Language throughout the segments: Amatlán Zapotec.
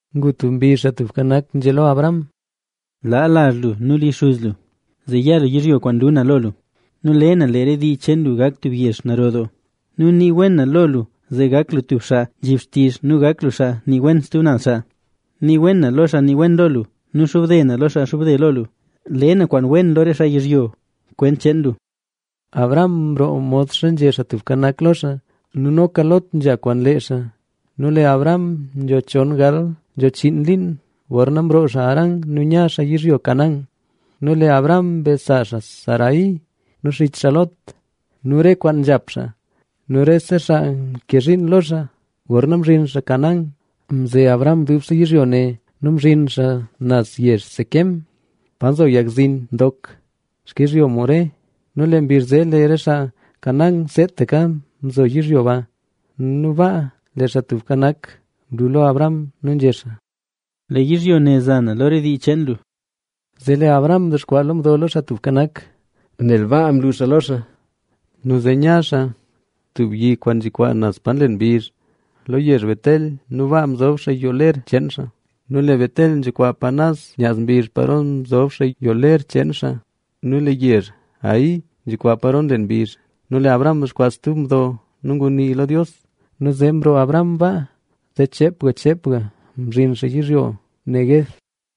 Ngu tub mbizh Xaa Tubka Nak nzhé lo Abram: —Laa lazh lu nu li xuz lu, zee ya lu yizhyo kwaan lu na lo lu. Le na lee re xtii lu gak tub yezh naro doo; nu nii wen na lo lu, zee gak lu tub xaa kwib xtizh nu gak lu xaa nii wen stub naz xaa. Nii wen na lo xaa nii wen lo lu nu xobde na lo xaa xobde lo lu. Le na kwaan wen lo re xaa yizhyo kwent cheen lu. Abram mroo modxa nzhé Xaa Tubka Nak lo xaa nu noka Lot nzha kwaan lee xaa. Nu lee Abram nzho chon gal nzho chiin liin gorna mroo xaa Harán nu nya xaa yizhyo Canaán. Nu lee Abram mbe sa xaa Sarai nu xich xaa Lot nu re kwaan nzhap xaa nu rese xaa mke zhiin lo xaa. Gorna mzhin xaa Canaán, mze Abram dubse yizhyo ne nu mzhin xaa naz yezh Siquem, pa nzo yag zin ndok xkizhyo More. Nu lee mbizh zee lee re xaa Canaán seetaka mzo yizhyo ba. Nu baa lee Xaa Tubka Nak mlu lo Abram nu nzhé xaa: —Lee yizhyo ne za na lo re dii cheen lu. Zee lee Abram mdexkwaa lo mdo lo Xaa Tubka Nak, nel baa mlu xaa lo xaa. Nu zee nya xaa tub yi kwaan nzhikwaa naz pa nlen mbizh lo yezh Betel nu baa mzob xaa yoo ler cheen xaa. Nu lee Betel nzhikwaa pa naz nyaz mbizh paro mzob xaa yoo ler cheen xaa nu lee yezh Hai nzhikwaa paro nlen mbizh. Nu lee Abram mdexkwaa tub mdo nu ngunii lo Dios. Nu zee mroo Abram baa, zee cheepga cheepga mzhin xaa yizhyo Neguev.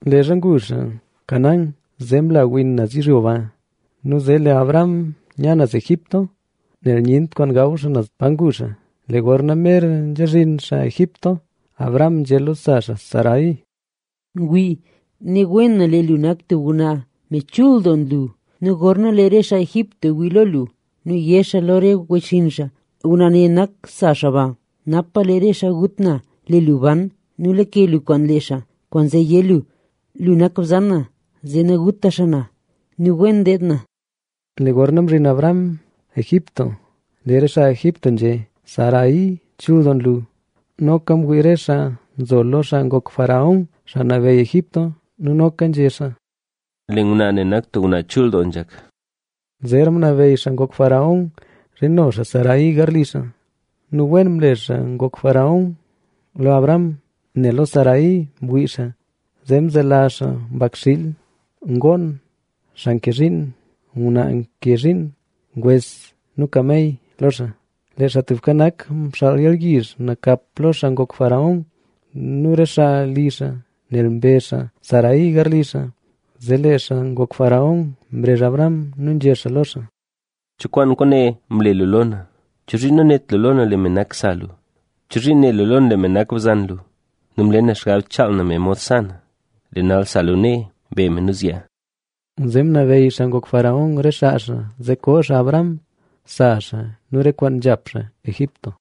Leezha ngu xaa Canaán, zee mla win naz yizhyo ba, nu zee lee Abram nya naz Egipto nel nyent kwaan gaw xaa naz pa ngu xaa. Lee gorna mer nzha zhin xaa Egipto, Abram nzhé lo sa xaa Sarai: —Wii, ne wen na lee lu nak tub ngwnaa, me chul doo nlu. Nu gorna lee re xaa Egipto wii lo lu nu yé xaa lo re wechxinn xaa: “Ngwnaa ne nak sa xaa ba”. Napa lee re xaa gut na, lee lu ban nu lake lu kwaan lee xaa. Kwaanzee yé lu: “Lu nak bzan na”, zee naguta xaa na nu wen deed na. Lee gorna mzhin Abram Egipto, lee re xaa Egipto nzhé: “¡Sarai chul doo nlu!” Noka mwii re xaa nzo lo xaa ngok faraón, xaa nabeyy Egipto nu noka nzhé xaa: —¡Lee ngwnaa ne nak tub ngwnaa chul doo nzhak! Zeera ngunabeyy xaa ngok faraón zhino xaa Sarai garli xaa. Nu wen mle xaa ngok faraón lo Abram nel lo Sarai ngwii xaa, zee mzelazh xaa mbakxiil, ngoon, xaa nke zhiin, ngwnaa nke zhiin, ngwes nu kamey lo xaa. Lee Xaa Tubka Nak mxaal yalyizh nakap lo xaa ngok faraón nu re xaa li xaa nel mbe xaa Sarai garli xaa. Zee lee xaa ngok faraón mrezh Abram nu nzhé xaa lo xaa: —¿Cho kwaan kwaane mle lu lo na? ¿Chozhiin nanét lu lee me nak sa lu? ¿Chozhiin né lu lee me nak bzan lu? Nu mle na xgab chaal na me mod sa na. ¡Lee nal, sa lu nee, be me nu zyaa! Zee ngunabeyy xaa ngok faraón re xaa xaa zee koo xaa Abram, sa xaa nu re kwaan nzhap xaa Egipto.